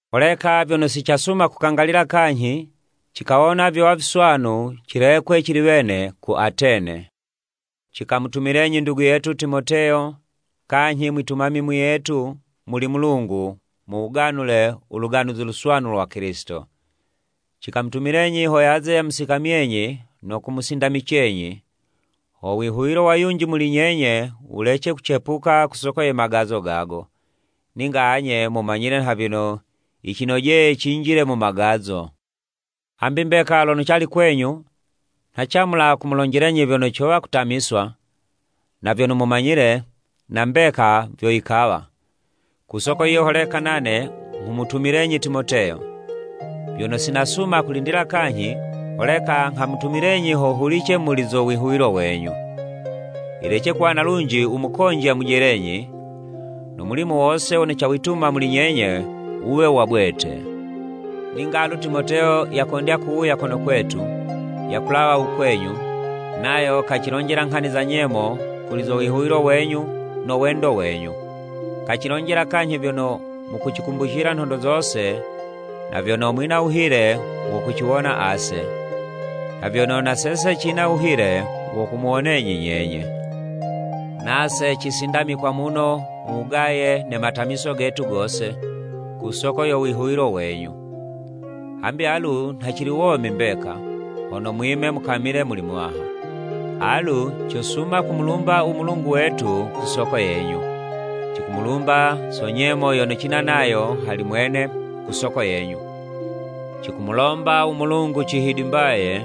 Holeka vyono si casuma kukangalila kanyhi, cikawona vyowa viswanu cilekwe cili wene ku Atene, cikamutumilenyi ndugu yetu Timoteyo, kanyhi mwitumami muyetu muli Mulungu mu wuganule u Luganuzi Luswanu lwa Kilisito. Cikamutumilenyi ho yaze yamusikamyenyi no kumusindamicenyi, ho wihuwilo wa yunji muli nyenye wulece kucepuka ku soko ye magazo gago. Ninga anye mumanyile nha vyono yicinojeye cinjile mu magazo. Hambi mbeka lono cali kwenyu, nha camula kumulonjelenyi vyono cowa kutamiswa, na vyono mumanyile, na mbeka vyo yikawa. Ku soko yiyo holeka nane nghamutumilenyi Timoteyo. Vyono si nasuma kulindila kanyhi, holeka nghamutumilenyi ho hulice muli zo wihuwilo wenyu. Yilece kuwa na lunji u mukonji yamujelenyi, no mulimo wose wono cawituma muli nyenye wuwe wa bwete! Ninga alu Timoteyo yakondya kuwuya kono kwetu, yakulawa u kwenyu, nayo kacilonjela nghani za nyemo kuli zo wihuwilo wenyu no wendo wenyu. Kacilonjela kanyhi vyono mukucikumbucila nhondo zose na vyono mwina wuhile wo kuciwona ase, nha vyono na sese cina wuhile wo kumuwonenyi nyenye. Nase cisindamikwa muno mu wugaye ne matamiso getu gose, ku soko yo wihuwilo wenyu. Hambi alu nha cili womi mbeka, hono mwime mukamile muli Muwaha. Alu cosuma kumulumba u Mulungu wetu ku soko yenyu. Cikumulumba so nyemo yono cina nayo hali mwene ku soko yenyu. Cikumulomba u Mulungu cihidimbaye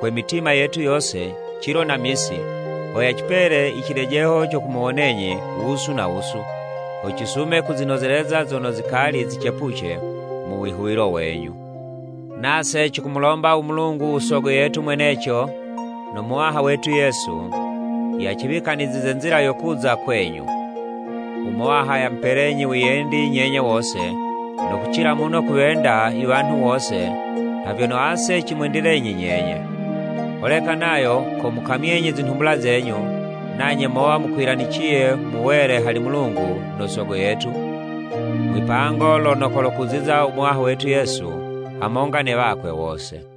kwe mitima yetu yose cilo na misi, ho yacipele i cilejeho co kumuwonenyi wusu na wusu, ho cisume kuzinozeleza zono zikali zicepuce mu wihuwilo wenyu. Nase cikumulomba u Mulungu u Sogo yetu mweneco, no Muwaha wetu Yesu, yaciwikanizize nzila yo kuza u kwenyu. U Muwaha yamupelenyi wiyendi nyenye wose, no kucila muno kuwenda i wanhu wose, nha vyono ase cimwendilenyi nyenye. Holeka nayo komukamyenyi zinhumbula zenyu, nanye mowa mukwilaniciye mu wele hali Mulungu no Sogo yetu, mwipango lono kolokuziza u Muwaha wetu Yesu hamonga ne wakwe wose.